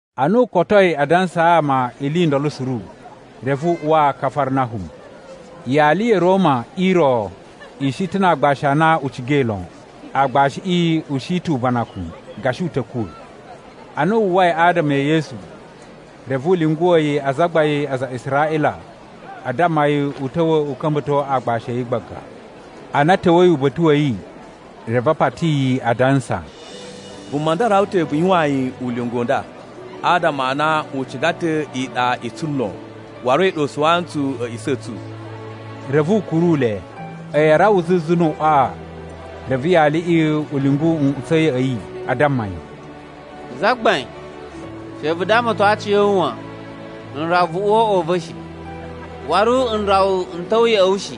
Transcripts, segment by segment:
Ana u kotoi a dansaa ama ili i ndolo suru, reve u uwa Kafarnahum. Yali ya̱ Roma i ro i shi ta̱ na aagbashi a na u cigai lon. Aagbashiꞌi u shi ta̱ ubanakun, gashi u ta̱ kuwa̱. Ana wu uwwai adama e Yesu, reve u lyunguwa̱ yi azagbain a aza a Israꞌila a damma yi u ta̱wa̱ u ka̱mba̱to aagbashi a̱ yi gbaga. Ana a̱ ta̱wa̱i uba̱ta̱ wa̱ yi, reve a pati yi, adansa, “Vuma nda rawa ta̱ vu yuwaan yi ulinga u nda, adama a na u ciga ta̱ iɗa i tsu lon, waru a̱yi ɗa u suwaa ntsu a̱a̱ꞌisa̱ a̱ tsu.” Reve u kuru le. A̱yi a rawa zuzu nu uꞌwaꞌa, reve yaliꞌi u lyungu nꞌutsa̱ ya̱ꞌa̱ yi, a damma yi, “Zagbain, she vu damaton aciya̱wu wan. N rawa vu uwa o uꞌwa u va̱ shi. Waru n rawa n ta̱wa̱ ya̱ꞌa̱ wu shi.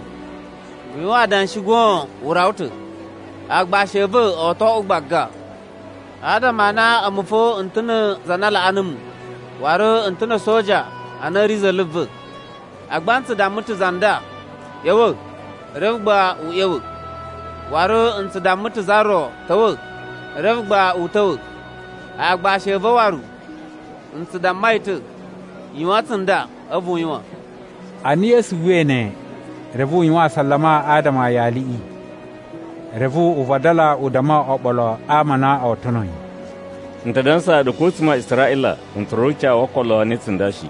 Vu yuwan adanshi goon u rawa ta̱, aagbashi a̱ va̱ o to oꞌwo gbaga. Adama a na a̱mu fo n ta̱ na̱ za na laꞌa numu, waru n ta̱ na̱ a̱soja a na a̱ ri za̱la̱ va̱. Agba n tsu damma ta̱ za nda, ‘ꞌYa̱wa̱,’ reve gba u ꞌya̱wa̱. Waru n tsu damma ta̱ za ro, ‘Ta̱wa̱’, reve gba u ta̱wa̱. Aagbashi a̱ va̱ waru, n tsu damma yi ta̱, ‘Yuwan tsunda,’ a̱vu u yuwan.” Ana Yesu uwwai ne, reve u yuwan asalama adama a yaliꞌi. Reve u vadala u damma oɓolo a ama a na oo tono yi, “N ta dansaa ɗu, ko a̱tsuma̱ a Israꞌila n tsura̱ ucawu wo okolo ne tsunda shi.”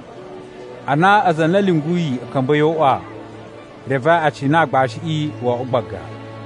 Ana aza a na a̱ lyunguyi a̱ ka̱mba̱i o uꞌwa, reve a cina aagbashiꞌi wo oꞌwo gbaga.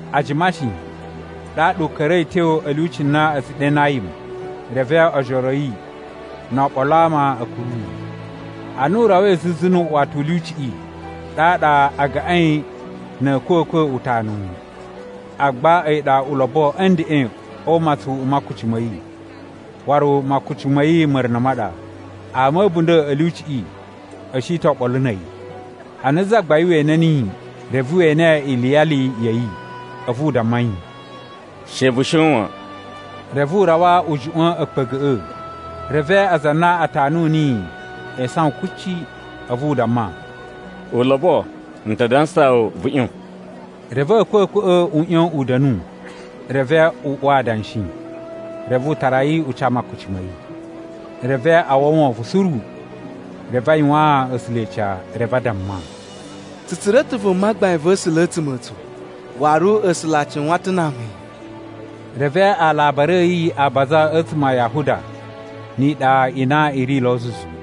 A jima shi, ɗaɗa u ka̱ra̱i a̱ tyo a̱ lyuci na a̱ tsu ɗe Nayim, reve ojoro a̱ yi no oɓolo a ama a̱ kuru yi. Ana u rawai zuzu nu uꞌuwata u lyuciꞌi, ɗaɗa a gaꞌain na̱ a̱a̱kwa̱kwa̱ utanuwu. Agba a̱yi ɗa ulobo a̱ ndeꞌen o umatsun u makuci ma̱ yi; waru makuci ma̱ yi ma̱runa̱ ma ɗa. Ama a̱ a̱bunda̱ a̱ lyuciꞌi a̱ shi ta̱ oɓolo na̱ a̱yi. Ana Zagbain we ene niyi, reve we ene iliyali ya̱ yi, a̱vu u damma yi, “She vu shon wan.” Reve u rawa u juꞌwa̱n a̱a̱kpa̱ga̱ꞌa̱, reve aza a na a tanu niyi e isawan kuci. A̱vu u damma, “Ulobo, n ta dansaa wu, vu ꞌyon.” Reve a̱a̱kwa̱kwa̱ꞌa̱ u ꞌyon u da̱nu, reve u uwa adanshi. Reve u tara yi u ca makuci ma̱ yi. Reve a uwwa wovon suru, reve a yuwaan A̱sula̱ ica. Reve a damma, “Tsu tsura̱ ta̱ vuma gbain va̱ A̱sula̱ a̱tsuma̱ a̱ tsu!” Waru, “A̱sula̱ a cuwan ta̱ na ama a̱ yi!” Reve alabari a̱ yi a baza a̱tsuma̱ a Yahuda ni iɗa i na i ri lo zuzu.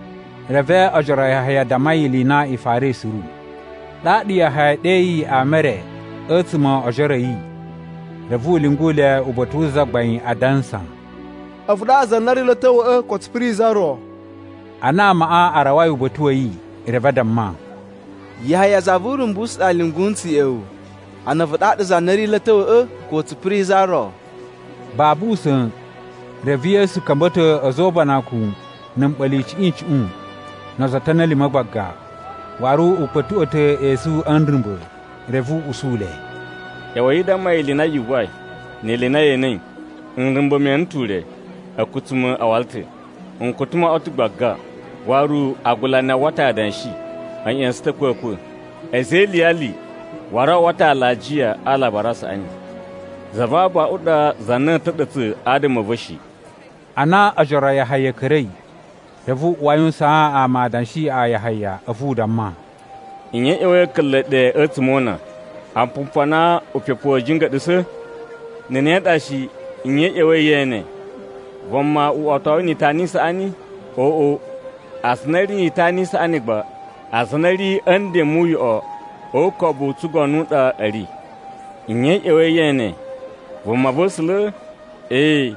Reve ojoro a Yahaya a damma yi ili i na i farai suru. Ɗaɗa Yahaya ɗeyi ama e re a̱tsuma̱ o ojoro a̱ yi, reve u lyungu le uba̱ta̱ wu Zagbain, adansa, “A̱vu ɗaɗa za na ri lo a̱ ta̱wa̱ꞌa̱, ko tsu piri za ro?” Ana amaꞌa a rawai uba̱ta̱ wa̱ yi, reve a damma, “Yahaya za vu Urumbusu ɗa lyungu ntsu ya̱ꞌa̱ wu, ana, ‘A̱vu ɗaɗa za na ri lo a̱ ta̱wa̱ꞌa̱ ko tsu piri za ro?’” Babu usa̱n, reve Yesu ka̱mba̱to a̱za̱ o ubanakun na̱ mɓa̱la̱ icuꞌun icuꞌun, no ozo o otoni a̱ lima̱ gbaga. Waru u kpa̱tuꞌwa̱ ta̱ esu a̱ nrumba̱. Reve u usu le, “ꞌYa̱wa̱i i damma yi ili i na yu uwwai, ni ili i na ye enei: nrumba̱ me ene ta̱ ure, a̱kutsuma̱ a wala ta̱, nkutu mo oꞌwo ta̱ gbaga. Waru agulani a uwwa ta̱ adanshi, a̱ ꞌya̱sa̱n ta̱ a̱kwa̱kwa̱. A̱za̱ e iliyali waru a uwwa ta̱ alajiya a Alabari a Saꞌani. Za va abaꞌun ɗa za na a̱a̱ ta̱ɗa̱tsa̱ adama a̱ va̱ shi.” Ana ojoro a Yahaya a̱ ka̱ra̱i, reve u uwa a yuwusaan amaꞌa adanshi a Yahaya, a̱vu u damma, “Nye i ꞌya̱wa̱i a̱ka̱nla̱ ɗe a̱tsuma̱ o una? Apumpu a na upepu wa̱a̱ jinga̱ɗa̱sa̱? Na̱ ne ɗa shi, nye i ꞌya̱wa̱i ye ene? Vuma uꞌwotowu ni itana i saꞌani? Oꞌo, aza a na a̱ ri ni itana i saꞌani gba, aza a na a̱ ri a̱ nden mu uyoꞌo o ukobu u tsugono u ɗa a̱ ri. Nye i ꞌya̱wa̱i ye ene? Vumava̱sula̱? Ee,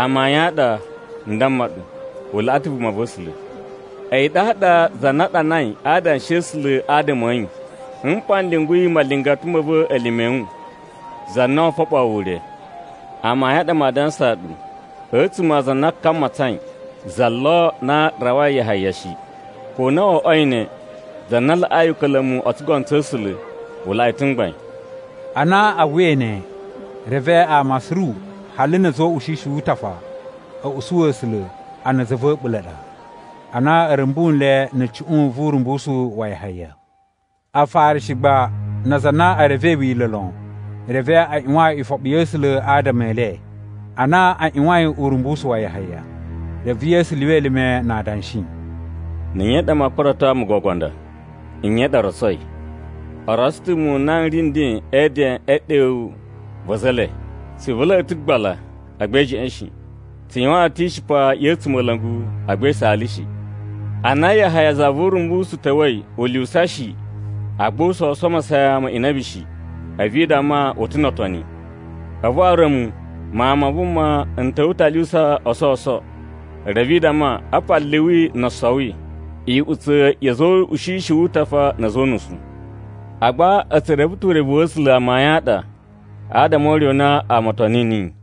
amayun a ɗa, n damma ɗu, u laꞌa ta̱ vumava̱sula̱. A̱yi ɗaɗa za na a ɗanai a Adanshi a̱ A̱sula̱ adama a̱ yi, ‘Mpa n lyunguyi malingata ma̱ va̱ elime a̱ wu, za na oo foɓoo wu ure.’ Amayun a ɗa maa dansaa ɗu, a̱tsuma̱ a aza a na ka matsain, za lo na rawai Yahaya shi. Ko ana wo oꞌwoi ne, za na laꞌai uka̱la̱mu o tsugono tsa̱ A̱sula̱ u laꞌa yi ta̱ mgbain.” Ana a uwwai ne, reve ama suru hali na̱ a̱za̱ o ushishi wu utafa a̱ usu A̱sula̱ a na za va̱ a̱ɓula̱ a ɗa, ana a̱ rumbu nle na̱ cuꞌun vu urumbusu wa Yahaya. Afarishi gba na aza a na e revei Wila̱ lon, reve a ꞌyuwan ifoɓi ya̱ A̱sula̱ adama e le, ana a ꞌyuwain urumbusu wa Yahaya. Reve Yesu lyuwa elime na adanshi, “Na̱ nye ɗa maa kurato ama o gogo a nda? Nye i ɗa o rotsoi? O rotso ta̱ muwun n na n ri nden e eden e ɗewu va̱ a̱za̱ e le, ‘Tsi ivula̱a̱ ɗu ta̱ gbala, agba i jeꞌen shi. Tsu yuwaan ɗu ta̱ ishipa ya̱ a̱tsumola̱ngu, agba i saala shi.’ “Ana Yahaya za vu Urumbusu ta̱wa̱i u lyuwusa shi, agba u sowuso masayan ma inabi shi; a̱vu i damma, ‘U ta̱ no otoni!’ A̱vu waru a̱mu Mawun ma Vuma n ta̱wa̱ ta̱ a lyuwusa o sowuso, reve i damma, ‘Apa liwi no osowi, iꞌutsa̱ ya̱ a̱za̱ o ushishi wu utafa na̱ a̱za̱ o unusu!’ Agba a̱ tsu reve ta̱ urevu wa̱ A̱sula̱ amayun a ɗa adama o ure u na ama o toni niyi.”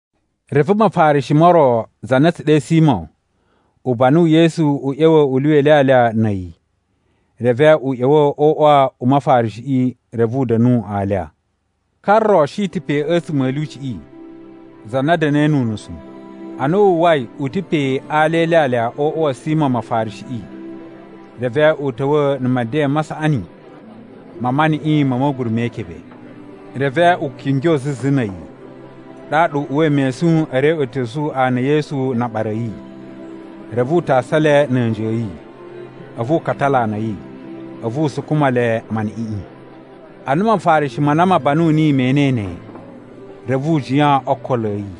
Reve Mafarishi mo ro, za na a̱ tsu ɗe Simo, u banu Yesu u ꞌya̱wa̱ u lyuwa ilyalya na̱ a̱yi. Reve u ꞌya̱wa̱ o uꞌwa u Mafarishiꞌi, reve u da̱nu alya. Ka ro shi ta̱ pe a̱tsuma̱ a̱ lyuciꞌi, za na da̱na̱i nu unusu. Ana wu uwwai u ta̱ pe a alya e ilyalya o uꞌwa wa̱ Simo Mafarishiꞌi, reve u ta̱wa̱ na̱ meden ma saꞌani ma maniꞌin ma̱ ma̱guru me ikebe. Reve u kingyo zuzu na̱ a̱yi, ɗaɗa u uwai mesun e reꞌwetosu ana e Yesu na aɓara a̱ yi. Reve u tasa le na̱ a̱nji a̱ yi, a̱vu u katala ana a̱ yi. A̱vu u sukuma le maniꞌiꞌin. Ana Mafarishi ma na ma banu niyi me enei ne, reve u jiyan o ookolo a̱ yi,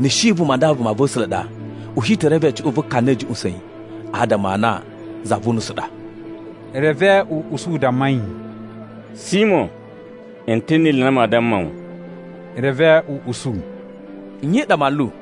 “Na̱ shi vuma nda vumava̱sula̱ ɗa, u shi te reve cuꞌun vu ka ne ɗa a̱ juꞌusa̱n yi, adama a na za vu unusu ɗa.” Reve u usu u damma yi, “Simo, n ta̱ ni ili i na maa damma wu.” Reve u usu, “Nye i ɗa, manlu?”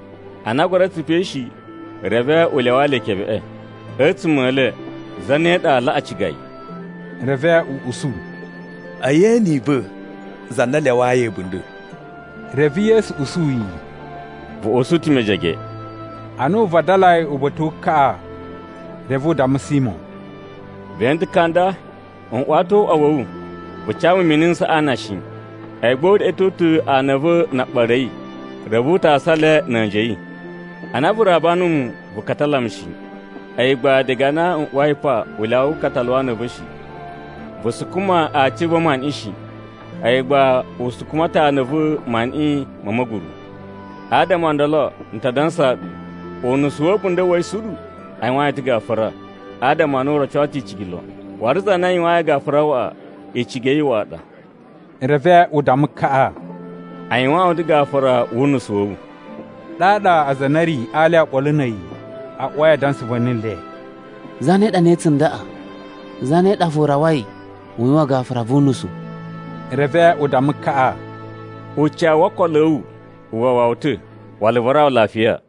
Ana a gura tsupai shi, reve u lyawaa le ikebeꞌe. A̱tsuma̱ e le zane ɗa aa laꞌa ciga yi?” Reve u usu, “E yeni i va̱, za na a lyawayi a̱bunda̱.” Reve Yesu usu yi, “Vu usu ta̱ mejege.” Ana u vadalai uba̱ta̱ wu kaꞌa, reve u damma Simo, “Ve ene ta̱ ka nda? N uwa ta̱ o uꞌwa wa̱ wu, vu ca mu mini n saꞌa ana shi. A̱yi gba u reꞌweto ta̱ ana a̱ va̱ na aɓara a̱ yi, reve u tasa le na̱ a̱nji a̱ yi. Ana vu raba numu, vu katala mu shi. A̱yi gba diga ana n uwai pa u lyawa ukatalu wa ana a̱ va̱ shi. Vu sukuma aaci a̱ va̱ maniꞌin shi. A̱yi gba u sukuma ta̱ ana a̱ va̱ maniꞌin ma̱ ma̱guru. Adama o ndolo n ta dansaa wu, unusu wa̱ a̱bunda̱ wa̱ yi suru a yuwaan yi ta̱ gafura, adama a na u roco ta̱ icigi lon. Waru za na a yuwayin gafura waꞌa, icigi ya̱ yi waꞌa ɗa.” Reve u damma kaꞌa, “A yuwaan wu ta̱ gafura wu unusu wa̱ wu.” Ɗaɗa aza a na a̱ ri a alya oɓolo na̱ a̱yi a uwai a dansa va̱ni le, “Zane ɗa ne tsundaꞌa, zane ɗa fo rawai u yuwan gafura vu unusu?” Reve u damma kaꞌa, “Ucawu wo okolo a̱ wu u wawa wu ta̱. Wala vu rawa lafiya.”